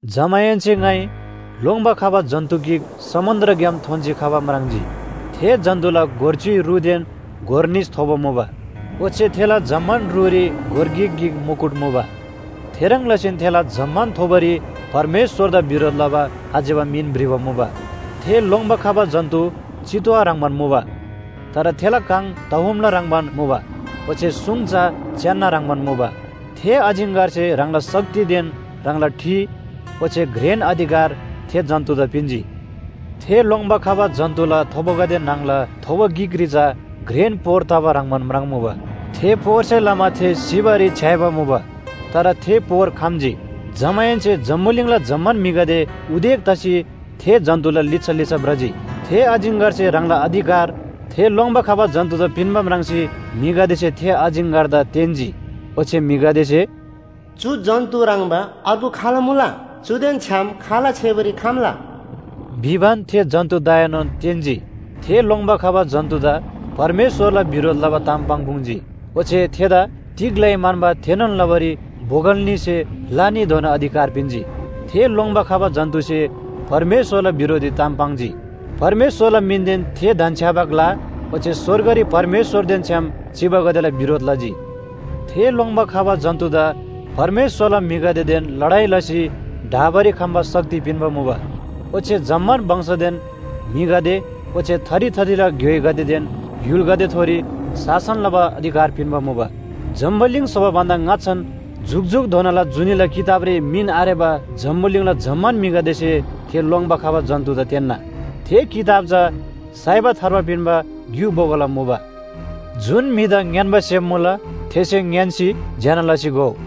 जमाहेन्‍से ङाइ लोङ्‌बा खबा जन्‍तु गिक समुन्‍द्रग्‍याम थोन्‍सी खबा म्राङ्जी। थे जन्‍तुला गोर च्‍युइ रुदेन गोर निस थोबो मुबा, ओच्‍छे थेला जम्‍मान रुरी गोर गिक गिक मुकुट मुबा। थेह्रङ् लसीन थेला जम्‍मान थोबोरी परमेश्‍वरदा बिरोध लबा आज्‍यबा मिन भ्रिबा मुबा। थे लोङ्‌बा खबा जन्‍तु चितुवा ह्रङ्‌बान मुबा। तर थेला काङ तहुमला ह्रङ्‌बान मुबा ओच्‍छे सुङ चा च्‍यान्‍ना ह्रङ्‌बान मुबा। थे अजिङ्‍गरसे ह्राङला शक्तिदेन ह्राङला ठि ओच्‍छे घ्रेन अधिकार थे जन्‍तुदा पिन्‍जी। थे लोङ्‌बा खबा जन्‍तुला थोबोगदे न्‍हङला थोबो गिकरी चा घ्रेन पोर तबा ह्रङ्‌बान म्राङ्‌मुबा, थे पोरसे लमा थे सिबारी छ्‌याइबा मुबा, तर थे पोर खम्‍जी। जमाहेन्‍से जम्‍बुलिङला जम्‍मान म्‍हिगदे उदेक तसी थे जन्‍तुला लिच्‍छा लिच्‍छा भ्रजी। थे अजिङ्‍गरसे ह्राङला अधिकार थे लोङ्‌बा खबा जन्‍तुदा पिन्‍बा म्राङ्सी म्‍हिगदेसे थे अजिङ्‍गरदा तेन्‍जी। ओच्‍छे म्‍हिगदेसे “चु जन्‍तु ह्रङ्‌बा अर्गु खाल मुला? चुदेन छ्‌याम खाल छेबारी खम्‍ला?” भिबान थे जन्‍तुदाएनोन तेन्‍जी। थे लोङ्‌बा खबा जन्‍तुदा परमेश्‍वरला बिरोध लबा ताम पाङ्‌पुङ्‌जी। ओच्‍छे थेदा तिग लइ म्‍हन्‍बा थेनोन लबारी बोगल न्‍हीसे ला न्‍हीधोना अधिकार पिन्‍जी। थे लोङ्‌बा खबा जन्‍तुसे परमेश्‍वरला बिरोधरी ताम पाङ्जी। परमेश्‍वरला मिनदेन थे धन्‍छ्‌याबा ग्‍ला ओच्‍छे स्‍वर्गरी परमेश्‍वरदेन छ्‌याम चिबागदेला बिरोध लजी। थे लोङ्‌बा खबा जन्‍तुदा परमेश्‍वरला म्‍हिगदेदेन लडाइ लसी ढाबारी खम्‍बा शक्ति पिन्‍बा मुबा। ओच्‍छे जम्‍मान वंशदेन म्‍हिगदे ओच्‍छे थरी थरीला ग्‍योइगदेदेन य्‍हुलगदेथोरी शासन लबा अधिकार पिन्‍बा मुबा। जम्‍बुलिङ स्‍होबा भन्‍दा ङाच्‍छान जुकजुकधोनाला जुनीला किताबरी मिन आरेबा जम्‍बुलिङला जम्‍मान म्‍हिगदेसे थे लोङ्‌बा खबा जन्‍तुदा तेन्‍ना। थे किताब चा साइबा थार्बा पिन्‍बा ग्‍यु बोगोला मुबा। जुन म्‍हिदा ङ्‌यान्‍बा सेम मुला, थेसे ङ्‌यान्‍सी ज्‍यना लसी घोउ।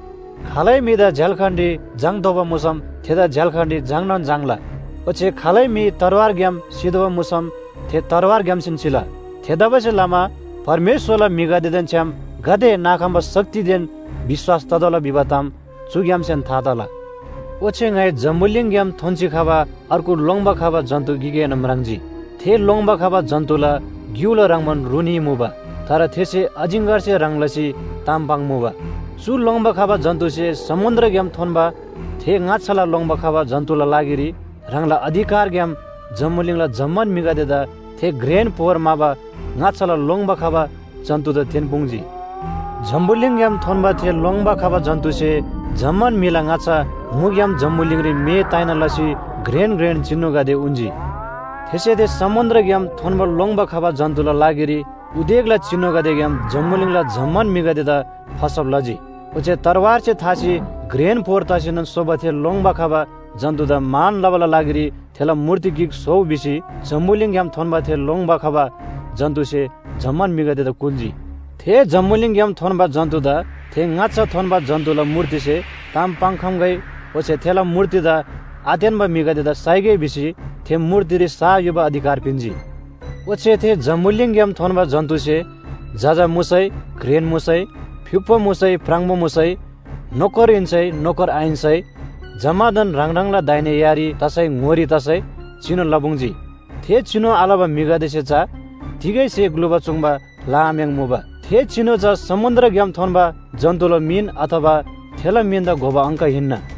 खालै म्‍हिदा झ्‍याल्‍खानरी झाङ्‌तोःबा मुसम थेदा झ्‍याल्‍खानरी झाङ्‌नोन झाङ्‌ला। ओच्‍छे खालै म्‍हि तरवारग्‍याम सितोःबा मुसम थे तरवारग्‍यामसेन सिला। थेतबासेलमा परमेश्‍वरला म्‍हिगदेदेन छ्‌याम गाते नाखम्‍बा शक्तिदेन विश्‍वास ततोःला भिबा ताम चुग्‍यामसेन था तला। ओच्‍छे ङाइ जम्‍बुलिङग्‍याम थोन्‍सी खबा अर्गु लोङ्‌बा खबा जन्‍तु गिकएनोन म्राङ्जी। थे लोङ्‌बा खबा जन्‍तुला ग्‍युला ह्रङ्‌बान रु न्‍ही मुबा। तर थेसे अजिङ्‍गरसे ह्रङ् लसी ताम पाङ्मुबा। चु लोङ्‌बा खबा जन्‍तुसे समुन्‍द्रग्‍याम थोन्‍बा थे ङाच्‍छाला लोङ्‌बा खबा जन्‍तुला लागिरी ह्राङला अधिकारग्‍याम जम्‍बुलिङला जम्‍मान म्‍हिगदेदा थे घ्रेन पोर म्‍हाबा ङाच्‍छाला लोङ्‌बा खबा जन्‍तुदा तेन्‍पुङ्‌जी। जम्‍बुलिङग्‍याम थोन्‍बा थे लोङ्‌बा खबा जन्‍तुसे जम्‍मान म्‍हिला ङाच्‍छा मुग्‍याम जम्‍बुलिङरी मे ताइना लसी घ्रेन घ्रेन चिनुगदे उन्‍जी। थेसे थे समुन्‍द्रग्‍याम थोन्‍बा लोङ्‌बा खबा जन्‍तुला लागिरी उदेकला चिनुगदेग्‍याम जम्‍बुलिङला जम्‍मान म्‍हिगदेदा फसब लजी। ओच्‍छे तरवारसे थासी घ्रेन पोर तसीनोन सोबा थे लोङ्‌बा खबा जन्‍तुदा मान लबाला लागिरी थेला मूर्ति गिक स्‍होउ भिसी जम्‍बुलिङग्‍याम थोन्‍बा थे लोङ्‌बा खबा जन्‍तुसे जम्‍मान म्‍हिगदेदा कुल्‍जी। थे जम्‍बुलिङग्‍याम थोन्‍बा जन्‍तुदा थे ङाच्‍छा थोन्‍बा जन्‍तुला मूर्तिसे ताम पाङ्‌खम्‍गै ओच्‍छे थेला मूर्तिदा आतेन्‍बा म्‍हिगदेदा साइगै भिसी थे मूर्तिरी सा युबा अधिकार पिन्‍जी। ओच्‍छे थे जम्‍बुलिङग्‍याम थोन्‍बा जन्‍तुसे जजा मुसै घ्रेन मुसै, फ्‍युक्‍पो मुसै प्राङबो मुसै, नोकर हिन्‍सै नोकर आहिन्‍सै जम्‍मादान ह्राङ ह्राङला दाहिने यारी तसै ङोरी तसै चिनु लपुङ्‌जी। थे चिनु आलबा म्‍हिगदेसे चा तिगै स्‍हे ग्‍लुबा चूङ्बा लआम्‍याङ्‌मुबा। थे चिनु चा समुन्‍द्रग्‍याम थोन्‍बा जन्‍तुला मिन अथवा थेला मिनदा घोबा अङ्क हिन्‍ना।